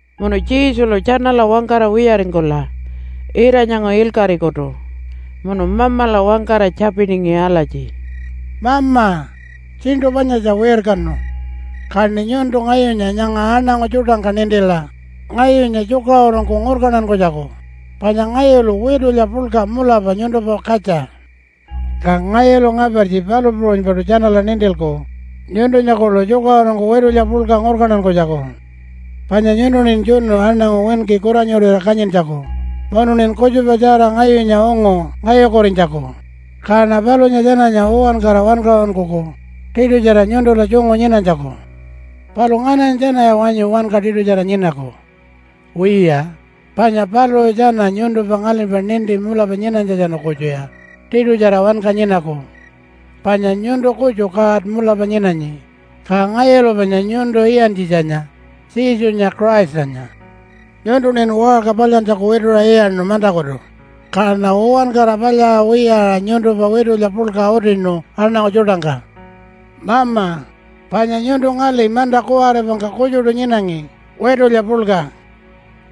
Munu Jesulu tjanala wangkara wiyaringkula ira-nyangu ilkaṟikutu munu Mamala wangkara tjapiningi alatji, “Mama, tjiṉṯu panyatja wirkanu. Kaṉi nyuntu ngayunya nyanga aṉangu tjuṯangka nintila ngayunya tjukaṟurungku ngurkantankunytjaku panya ngayulu witulya puḻka mulapa nyuntumpa katja. Ka ngayulu ngapartji palu puṟunypaṯu tjanala nintilku nyuntunya kuḻu tjukaṟurungku witulya puḻka ngurkantankunytjaku. Panya nyuntuṉin tjunu aṉangu winki kuranyurira kanyintjaku munuṉin kutjupatjara ngayunya ungu ngayukurinytjaku, kaṉa palunya tjananya uwankara wankaṟunkuku tiṯutjara nyuntula tjungu nyinanytjaku. Palu ngananya tjanaya wanyu wanka tiṯutjara nyinaku? Wiya, panya paluṟu tjana nyuntumpa ngalimpa ninti mulapa nyinanytjatjanu kutjuya tiṯutjara wanka nyinaku. Panya nyuntu kutju God mulapa nyinanyi, ka ngayulu panya nyuntu iyantjitjanya, Jesunya Christanya. Nyuntuṉin waṟka palyantjaku wituṟa iyaṉu mantakutu, kaṉa uwankara palyaṟa wiyaṟa nyuntumpa witulya puḻka utinu aṉangu tjuṯangka. Mama, panya nyuntu ngali manta kuwaripangka kutjuṯu nyinangi witulya puḻka.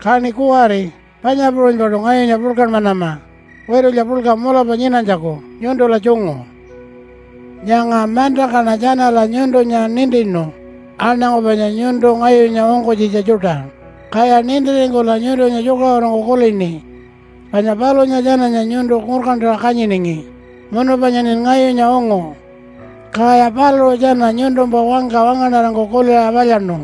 Kaṉi kuwari panya puṟunypaṯu ngayunya puḻkanmanama witulya puḻka mulapa nyinanytjaku nyuntula tjungu. “Nyanga mantangkaṉa tjanala nyuntunya nintinu aṉangu panya nyuntu ngayunya ungkunytjitja tjuṯa, kaya nintiringkula nyuntunya tjukaṟurungku kulini. Panya palunya tjananya nyuntu ngurkantaṟa kanyiningi, munu panyaṉin ngayunya ungu. Kaya paluṟu tjana nyuntumpa wangka wangaṉarangku kuliṟa palyaṉu.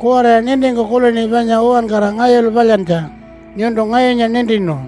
Kuwariya nintingku kulini panya uwankara ngayulu palyantja nyuntu ngayunya nintinu.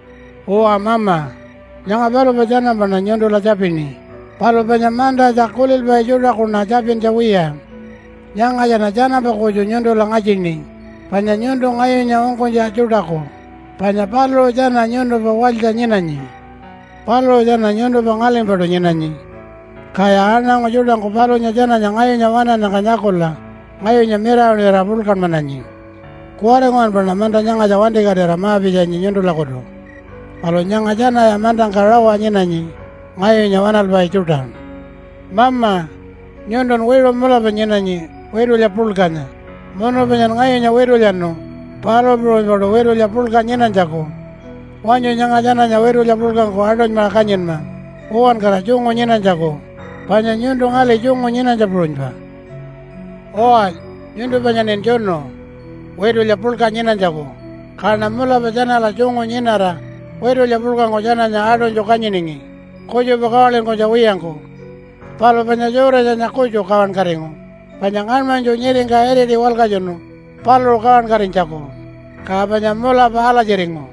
“Uwa Mama, nyanga palumpa tjanampaṉa nyuntula tjapini, palu panya mantatja kulilpai tjuṯakuṉa tjapintja wiya. Nyangatjaṉa tjanampa kutju nyuntula ngatjini panya nyuntu ngayunya ungkunytja tjuṯaku, panya paluṟu tjana nyuntumpa walytja nyinanyi. Paluṟu tjana nyuntumpa ngalimpaṯu nyinanyi. Kaya aṉangu tjuṯangku palunya tjananya ngayunya waṉannyangka nyakula ngayunya mirawaṉira puḻkanmananyi. Kuwari nguwanpaṉa manta nyangatja wantikatira ma-pitjanyi nyuntulakutu. Palu nyanga tjanaya mantangka rawa nyinanyi, ngayunya waṉalpai tjuṯa. Mama, nyuntun wiṟu mulapa nyinanyi witulya puḻkanya, munu panyan ngayunya witulyanu palu puṟunypaṯu witulya puḻka nyinanytjaku. Wanyu nyanga tjananya witulya puḻkangku aṯunymaṟa kanyinma uwankara tjungu nyinanytjaku, panya nyuntu ngali tjungu nyinanytja puṟunypa. “Uwa, nyuntu panyaṉin tjunu witulya puḻka nyinanytjaku, kaṉa mulapa tjanala tjungu nyinara witulya puḻkangku tjananya aṯunytju kanyiningi kutjupa kawalinkunytja wiyangku. Palu panya Judasanya kutju kawankatingu, panya ngaṉmanytju nyiringka iriti walkatjunu paluṟu kawankatinytjaku, ka panya mulapa alatjiringu.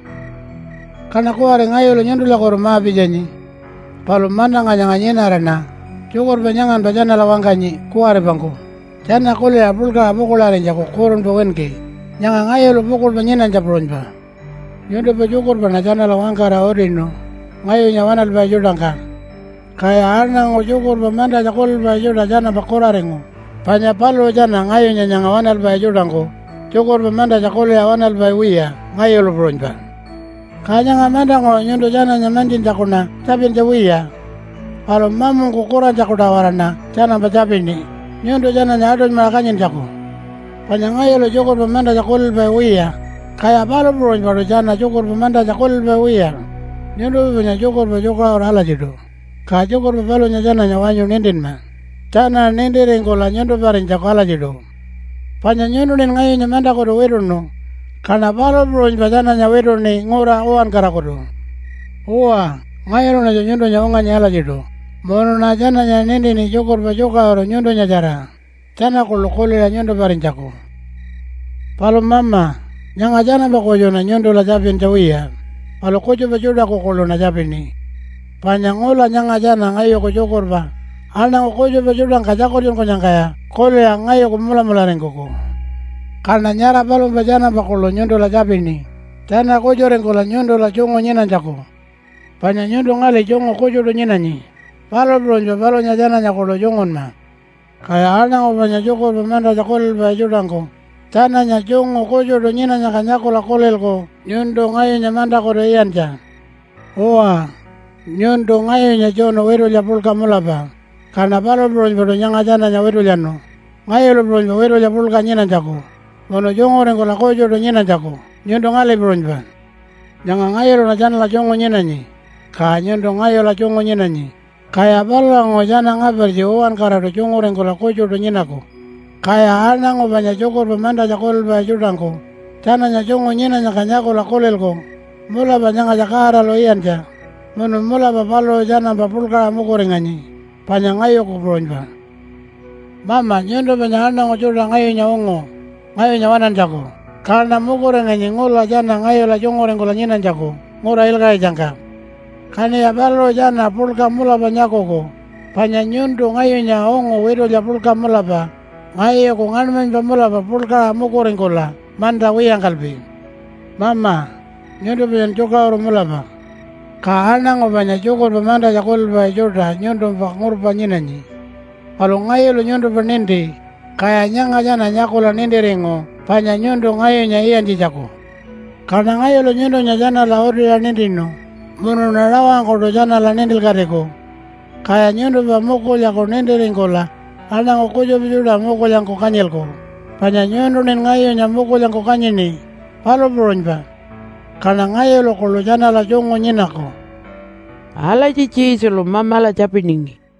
“Kaṉa kuwari ngayulu nyuntulakutu ma-pitjanyi. Palu mantangka nyanga nyinaraṉa tjukurpa nyanganpa tjanala wangkanyi kuwaripangku tjana kuliṟa puḻkaṟa pukuḻarinytjaku kurunpa winki, nyanga ngayulu pukuḻpa nyinanytja puṟunypa. Nyuntumpa tjukurpaṉa tjanala wangkara utinu ngayunya waṉalpai tjuṯangka. Kaya aṉangu tjukurpa mantatja kulilpai tjuṯa tjanampa kuraringu, panya paluṟu tjana ngayunya nyanga waṉalpai tjuṯangku tjukurpa mantatja kuliṟa waṉalpai wiya, ngayulu puṟunypa. Ka nyanga mantanguṟu nyuntu tjananya mantjintjakuṉa tjapintja wiya. Palu mamungku kurantjaku-tawaraṉa tjanampa tjapini nyuntu tjananya aṯunymaṟa kanyintjaku. Panya ngayulu tjukurpa mantatja kulilpai wiya, kaya palu puṟunypaṯu tjana tjukurpa mantatja kulilpai wiya. Nyuntumpa panya tjukurpa tjukaṟuru alatjiṯu, ka tjukurpa palunya tjananya wanyu nintinma tjana nintiringkula nyuntumparinytjaku alatjiṯu. Panya nyuntuṉin ngayunya mantakutu wituṉu, kaṉa palu puṟunypa tjananya wituṉi ngura uwankarakutu. Uwa, ngayuluṉatju nyuntunya unganyi alatjiṯu munuṉa tjananya nintini tjukurpa tjukaṟuru nyuntunyatjara tjana kuḻu kuliṟa nyuntumparinytjaku. “Palu Mama, nyanga tjanampa kutjuṉa nyuntula tjapintja wiya, palu kutjupa tjuṯaku kuḻuṉa tjapini. Panya ngula nyanga tjana ngayuku tjukurpa aṉangu kutjupa tjuṯangka tjakultjunkunyangkaya kuliṟa ngayuku mulamularingkuku. Kaṉa nyara palumpa tjanampa kuḻu nyuntula tjapini tjana kutjuringkula nyuntula tjungu nyinanytjaku. Panya nyuntu ngali tjungu kutjuṯu nyinanyi, palu puṟunypa palunya tjananya kuḻu tjungunma. Kaya aṉangu panya tjukurpa mantatja kulilpai tjuṯangku tjananya tjungu kutjuṯu nyinanyangka nyakula kulilku nyuntu ngayunya mantakutu iyantja. Uwa, nyuntu ngayunya tjunu witulya puḻka mulapa, kaṉa palu puṟunypaṯu nyanga tjananya witulyanu ngayulu puṟunypa witulya puḻka nyinanytjaku munu tjunguringkula kutjuṯu nyinanytjaku nyuntu ngali puṟunypa. Nyanga ngayuluṉa tjanala tjungu nyinanyi, ka nyuntu ngayula tjungu nyinanyi, kaya palulanguṟu tjana ngapartji uwankaraṯu tjunguringkula kutjuṯu nyinaku. Kaya aṉangu panya tjukurpa mantatja kulilpai tjuṯangku tjananya tjungu nyinanyangka nyakula kulilku mulapa nyangatja Godalu iyantja munu mulapa paluṟu tjanampa puḻkaṟa mukuringanyi, panya ngayuku puṟunypa. “Mama, nyuntu panya aṉangu tjuṯa ngayunya ungu ngayunya waṉantjaku. Kaṉa mukuringanyi ngula tjana ngayula tjunguringkula nyinanytjaku ngura ilkaṟitjangka. Kaṉiya paluṟu tjana puḻka mulapa nyakuku, panya nyuntu ngayunya ungu witulya puḻka mulapa ngayuku ngaṉmanypa mulapa puḻkaṟa mukuringkula manta wiyangkalpi. Mama, nyuntu panyan tjukaṟuru mulapa. Ka aṉangu panya tjukurpa mantatja kulilpai tjuṯa nyuntumpa ngurpa nyinanyi. Palu ngayulu nyuntumpa ninti, kaya nyanga tjana nyakula nintiringu panya nyuntu ngayunya iyantjitjaku. Kaṉa ngayulu nyuntunya tjanala utiṟa nintinu, munuṉa rawangkuṯu tjanala nintilkatiku. Kaya nyuntumpa mukulyaku nintiringkula aṉangu kutjupa tjuṯa mukulyangku kanyilku, panya nyuntuṉin ngayunya mukulyangku kanyini, palu puṟunypa. Kaṉa ngayulu kuḻu tjanala tjungu nyinaku.” Alatji Jesulu Mamala tjapiningi.